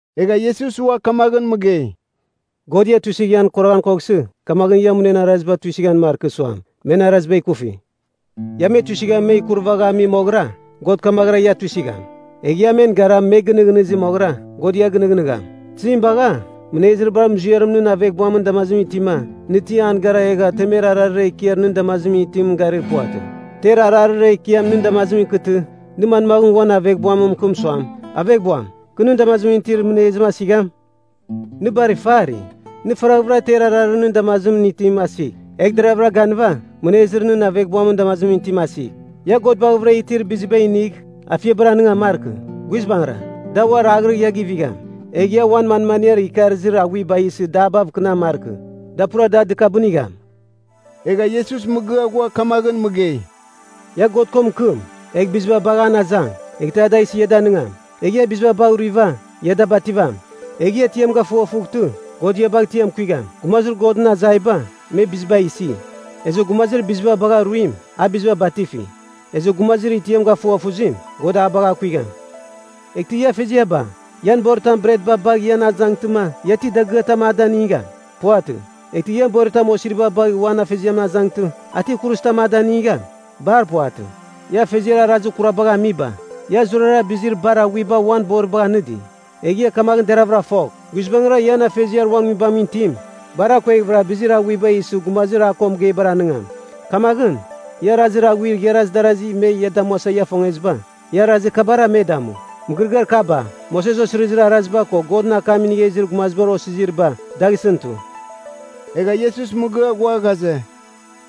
Egha Iesus ua kamaghɨn mɨgei, “God ia tuisɨgh ian kuraghan koghsɨ, kamaghɨn ia munen araziba tuisɨghan markɨ suam, men araziba ikufi. Ia me tuisɨgha men ikurvagha ami moghɨra, God kamaghɨra ia tuisɨgham. Egh ia men gara me gɨnɨghnɨzi moghɨra, God ia gɨnɨghnɨgham. Tizim bagha, mɨnezir bar muziarim nɨn aveghbuamɨn damazimɨn itima, nɨ ti an gara egha temer ararir ekiar nɨn damazimɨn itimɨn garir puvatɨ? Ter ararir ekiam nɨn damazimɨn ikɨtɨ, nɨ manmaghɨn uan aveghbuam mɨkɨm suam, ‘Aveghbuam, kɨ nɨn damazimɨn itir mɨnezim asigham?’ Nɨ bar ifari! Nɨ faraghvɨra ter ararir nɨn damazimɨn itim asigh, egh deragh ganɨva mɨnezir nɨn aveghbuamɨn damazimɨn itim asigh. “Ia God baghavɨra itir biziba inigh, afiabar anɨngan markɨ. Guizbangɨra, da ua raghrɨgh ia givigham. Egh ia uan manmaniar ikarɨzir aghuiba isɨ dabav kɨnan markɨ. Da pura da dɨkabɨnigham.” Egha Iesus mɨgɨa ghua kamaghɨn mɨgei, “Ia God ko mɨkɨm, egh biziba bagh an azang, eghtɨ a da isɨ ia danɨngam. Egh ia biziba bagh ruiva, ia da bativam. Egh ia tiam gafughafughtɨ, God ia bagh tiam kuigham. Gumazir Godɨn azaiba, me biziba isi. Ezɨ gumazir biziba bagha ruim, a biziba batifi. Ezɨ gumazir itiam gafughafuzim, God a bagh akuigham. Eghtɨ ia afeziaba, ian boritam bretba bagh ian azangtɨma, ia ti dagɨatam a danɨngam? Puvatɨ. Eghtɨ boritam osiriba bagh uan afeziamɨn azangtɨ, a ti kuruzitam a danɨngam? Bar puvatɨ. “Ia afeziar arazir kurabagh amiba, ia zurara bizir bar aghuiba uan boribagh anɨdi. Egh ia kamagh deraghvɨra fogh, guizbangɨra ian Afeziar uan Nguibamɨn itim bar akueghvɨra bizir aghuiba isɨ gumazir a ko mɨgeibar anɨngam. “Kamaghɨn, ia arazir aghuir igharaz darazi me ia damuasa ia ifongeziba, ia arazir kabara me damu. Mɨgɨrɨgɨar kaba, Moses Osirizir Araziba ko Godɨn akam inigha izir gumazibar osiziriba, dagh isɨn tu.” Egha Iesus mɨgɨa ghua ghaze,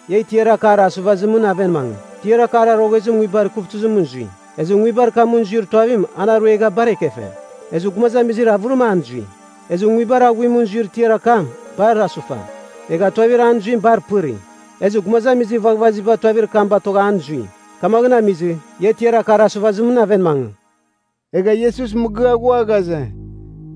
“Ia tiar akar asuvazimɨn aven mangɨ. Tiar akar aroghezim nguibar ikuvtɨzimɨn zui. Ezɨ nguibar kamɨn zuir tuavim an aruegha bar ekefe. Ezɨ gumazamizir avɨrim an zui. Ezɨ nguibar aghuimɨn zuir tiar akam bar asufa, egha tuavir an zuim bar pɨri. Ezɨ gumazamizir vaghvaziba tuavir kam batogha an zui. Kamaghɨn amizɨ, ia tiar akar asuvazimɨn aven mangɨ.” Egha Iesus mɨgɨa ghua ghaze,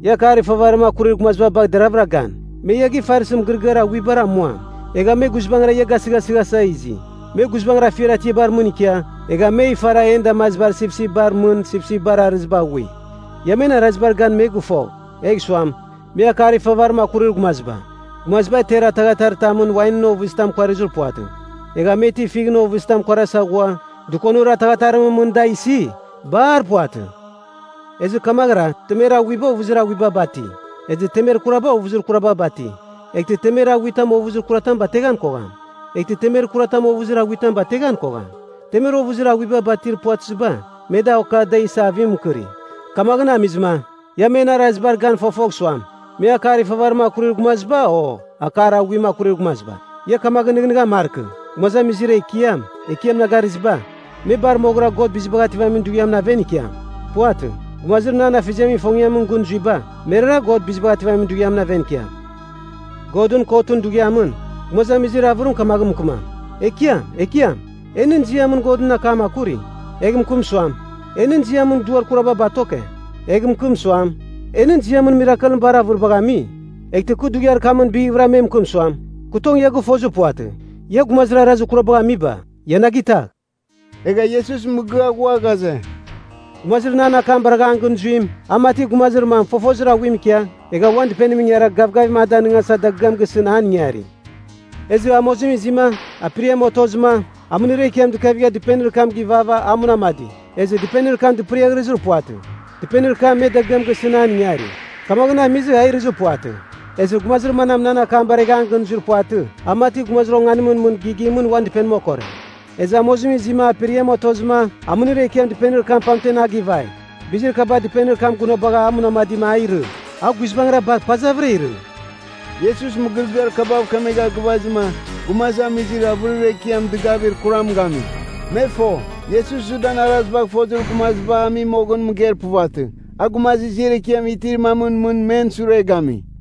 “Ia akar ifavarim akurir gumaziba bagh deravɨra gan. Me ia gifarsɨ mɨgɨrɨgɨar aghuibar amuam. Egha me guizbangɨra ia gasɨghasɨghasa izi. Me guizbangɨra afiar atiabar mɨn ikia, egha me ifara en damazibar sipsipbar mɨn sipsipbar arɨziba aghui. Ia men arazibar gan me gɨfogh, egh suam, me akar ifavarim akurir gumaziba. Gumaziba ter ataghataritamɨn wainɨn ovɨzitam kuarizir puvatɨ. Egha me ti fighɨn ovɨzitam kuarasa ghua, dɨkonir ataghatarimɨn, da isi? Bar puvatɨ. Ezɨ kamaghɨra temer aghuiba ovɨzir aghuiba bati, ezɨ temer kuraba ovɨzir kuraba bati. Eghtɨ temer aghuitam ovɨzir kuratam bateghan kogham. Eghtɨ temer kuratam ovɨzir aghuitam bateghan kogham. Temer ovɨzir aghuiba batir puvatɨziba, me da oka da isa avim mɨkɨri. Kamaghɨn amizɨma, ia men arazibar gan fofogh suam, me akar ifavarim akurir gumaziba, o akar aghuim akurir gumaziba. Ia kamaghɨn nɨghnɨghan markɨ, gumazamizir ‘Ekiam, Ekiam’ na garɨziba, me bar moghɨra God Bizibagh Ativamin Dughiamɨn aven ikiam. Puvatɨ. Gumazir nan Afeziamɨn ifongiamɨn gɨn zuiba, merara God Bizibagh Ativamin Dughiamɨn aven ikiam. Godɨn Kotɨn Dughiamɨn, gumazamizir avɨrim kamaghɨn mɨkɨmam, ‘Ekiam, Ekiam, e nɨn ziamɨn Godɨn akam akuri.’ Egh mɨkɨm suam, ‘E nɨn ziamɨn duar kuraba batoke,’ egh mɨkɨm suam, ‘E nɨn ziamɨn mirakelɨn bar avɨribagh ami.’ Eghtɨ kɨ Dughiar kamɨn bighvɨra me mɨkɨm suam, ‘Kɨ tong ia gɨfozir puvatɨ. Ia gumazir arazir kurabagh amiba, ia na gitagh!’” Egha Iesus mɨgɨa ghua ghaze, “Gumazir nan akam baragha an gɨn zuim, a mati gumazir mam fofozir aghuim ikia, egha uan dɨpenim ingara gavgavim a danɨngasa dagɨam gisɨn an ingari. Ezɨ amozim izima, aperiam otozɨma, amɨnir ekiam dɨkavigha dɨpenir kam givava a munamadi. Ezɨ dɨpenir kam dɨpɨriaghrɨzir puvatɨ. Dɨpenir kam me dagɨam gisɨn an ingari. Kamaghɨn amizɨ, a irɨzir puvatɨ. Ezɨ gumazir manam nan akam baregha an gɨn zuir puvatɨ, a mati gumazir onganimɨn mɨn gigimɨn uan dɨpenim okore. Ezɨ amozim izima aperiam otozɨma, amɨnir ekiam dɨpenir kam pamtem a givai. Bizir kaba dɨpenir kam gunabagha a munamadima, a irɨ. A guizbangɨra bar pazavɨra irɨ.” Iesus mɨgɨrɨgɨar kabav mɨkemegha gɨvazɨma, gumazamizir avɨrir ekiam dɨgavir kuram gami. Me fo, Iesus Judan arazibagh fozir gumaziba ami moghɨn mɨgeir puvatɨ. A gumazir ziar ekiam itir mamɨn mɨn men sure gami.